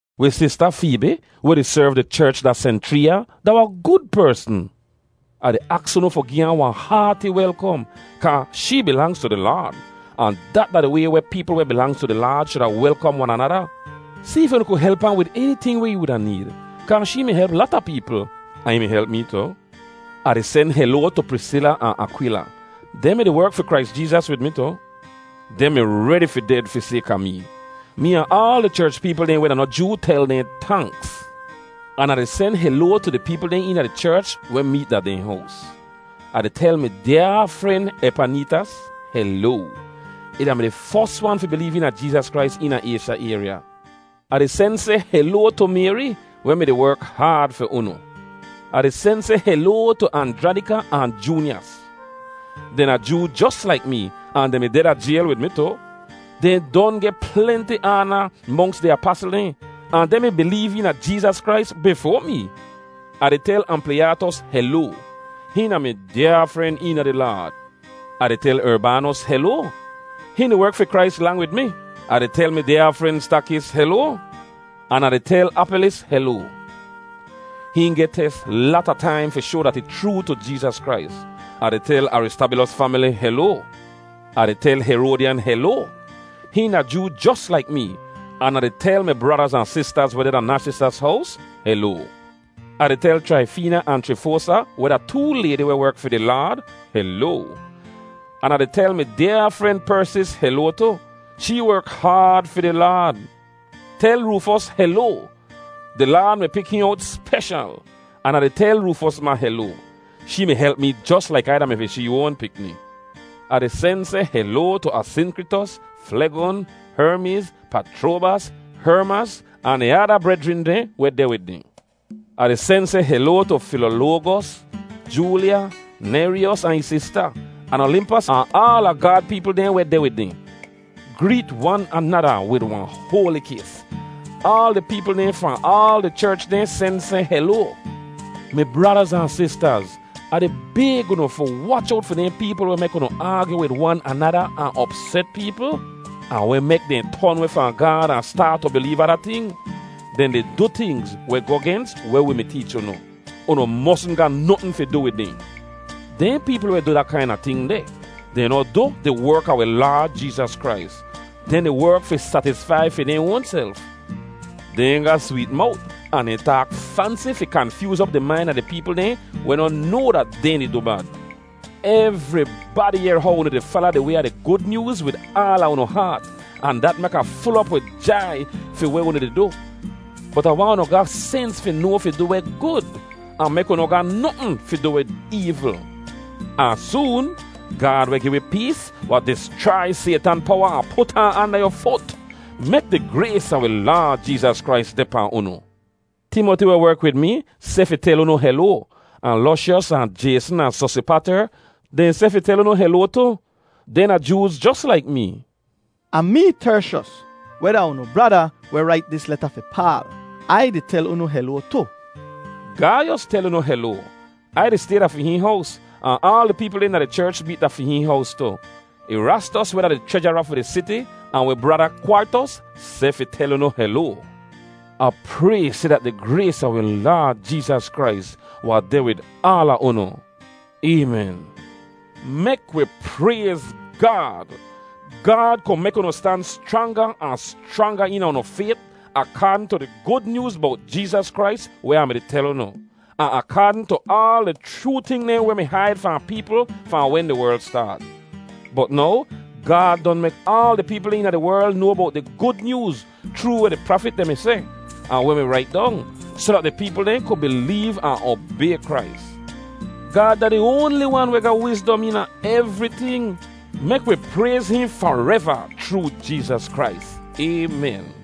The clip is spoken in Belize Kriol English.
Wi sista Feebi weh di serv di cherch da Senchreeya da wahn gud persn. Ah di aks unu fi gi ahn wahn haati welkom, kaa shee bilangz tu di Laad, ahn dat da di way weh peepl weh bilangz tu di Laad shuda welkom wan anada. Si if unu ku help ahn wid eniting weh ih wuda need, kaa shee mi help lata peepl, ahn ih mi help mee tu. Ah di sen heloa tu Prisila ahn Akwila. Dehn mi-di werk fi Krais Jeezas wid mi tu. Dehn mi redi fi ded fi sayka mee. Mee ahn aal di cherch peepl dehn weh da noh Joo tel dehn tanks. An Ah di sen seh heloa tu di peepl dehn eena di cherch weh meet da dehn hows. Ah di tel mi dyaa fren Epaneetas heloa. Ih da-mi di fos wan fi bileev eena Jeezas Krais eena Aysha ayrya. Ah di sen seh heloa tu Mayri, weh mi-di werk haad fi unu. Ah di sen seh heloa tu Anjranika ahn Joonyas. Dehn da Joo jos laik mee, ahn dehn mi deh da jayl wid mi tu. Dehn don geh plenti aana monks di apasl dehn, ahn dehn mi bileev eena Jeezas Krais bifoa mee. Ah di tel Ampliyatos heloa. Hihn da mi dyaa fren eena di Laad. Ah di tel Erbaanos heloa. Hihn di werk fi Krais lang wid mi. Ah di tel mi dyaa fren Stakis heloa. An Ah di tel Apelis heloa. Hihn geh tes lata taim fi shoa dat ih chroo tu Jeezas Krais. Ah di tel Aristabilos famili heloa. Ah di tel Heroadyan heloa. Hihn da Joo jos laik mee. An Ah di tel mi bradaz ahn sistaz weh deh da Narsisas hows heloa. Ah di tel Chraifeena ahn Chrifosa, weh da too laydi weh werk fi di Laad, heloa. An Ah di tel mi dyaa fren Persis heloa tu. Shee werk haad fi di Laad. Tel Roofos heloa. Di Laad mi pik hihn owt speshal. An Ah di tel Roofos ma heloa. Shee mi help mi jos laik Ai da-mi fi shee oan pikni. Ah di sen seh heloa tu Asinkritos, Flegon, Hermiz, Pachroabas, Hermas, ahn di ada brejrin dehn weh deh wid dehn. Ah di sen seh heloa tu Filoloagos, Joolya, Nehryos ahn ih sista, an Olimpas ahn aala Gaad peepl dehn weh deh wid dehn. Greet wan anada wid wahn hoali kis. Aal di peepl dehn fahn aal di cherch dehn sen seh heloa. Mi bradaz ahn sistaz, Ah di bayg unu fi wach owt fi dehn peepl weh mek unu aagyu wid wan anada ahn opset peepl, ahn weh mek dehn ton weh fahn Gaad ahn staat tu bileev ada ting. Dehn di du tingz weh goh gens weh wi mi teech unu. Unu mosn ga notn fi du wid dehn. Dehn peepl weh du da kaina ting deh, dehn noh du di werk a wi Laad Jeezas Krais. Dehn di werk fi satisfai fi dehn oanself. Dehn ga sweet mowt ahn dehn taak fansi fi kanfyooz op di main a di peepl dehn weh noh noa dat dehn di du bad. Evribadi yehr how unu di fala di way a di Gud Nyooz wid aala unu haat, ahn dat mek Ah ful op wid jai fi weh unu di du. Bot Ah waahn unu ga sens fi noa fi du weh gud, ahn mek unu noh ga notn fi du wid eevl. Ahn soon, Gaad, weh gi wi pees, wahn dischrai Saytan powa ahn put ahn anda yu fut. Mek di grays a wi Laad Jeezas Krais deh pahn unu. Timoti weh werk wid mi, seh fi tel unu heloa, ahn Lushyos ahn Jayson ahn Sosipater, dehn seh fi tel unu heloa tu. Dehn da Jooz jos laik mee. Ahn mee, Tershos, weh da unu brada weh rait dis leta fi Paal, Ai di tel unu heloa tu. Gaiyos tel unu heloa. Ai di stay da fi hihn hows, ahn aal di peepl dehn da di cherch meet da fi hihn hows tu. Erastos, weh da di chrejara fi di siti, ahn wi brada Kwartos, seh fi tel unu heloa. [Ah pray seh dat di grays a wi Laad Jeezas Krais wahn deh wid aala unu. Aymen.] Mek wi prayz Gaad! Gaad ku mek unu stan schranga ahn schranga eena unu fayt akaadn tu di Gud Nyooz bowt Jeezas Krais weh Ah mi-di tel unu, ahn akaadn tu aal di chroo ting dehn weh mi haid fahn peepl fahn wen di werl staat. Bot now Gaad don mek aal di peepl dehn eena di werl noa bowt di Gud Nyooz, chroo weh di prafit dehn mi seh, ahn weh mi rait dong; soh dat di peepl dehn ku bileev ahn obay Krais. Gaad da di oanli wan weh ga wizdom eena evriting. Mek wi prayz hihn fareva chroo Jeezas Krais! Aymen.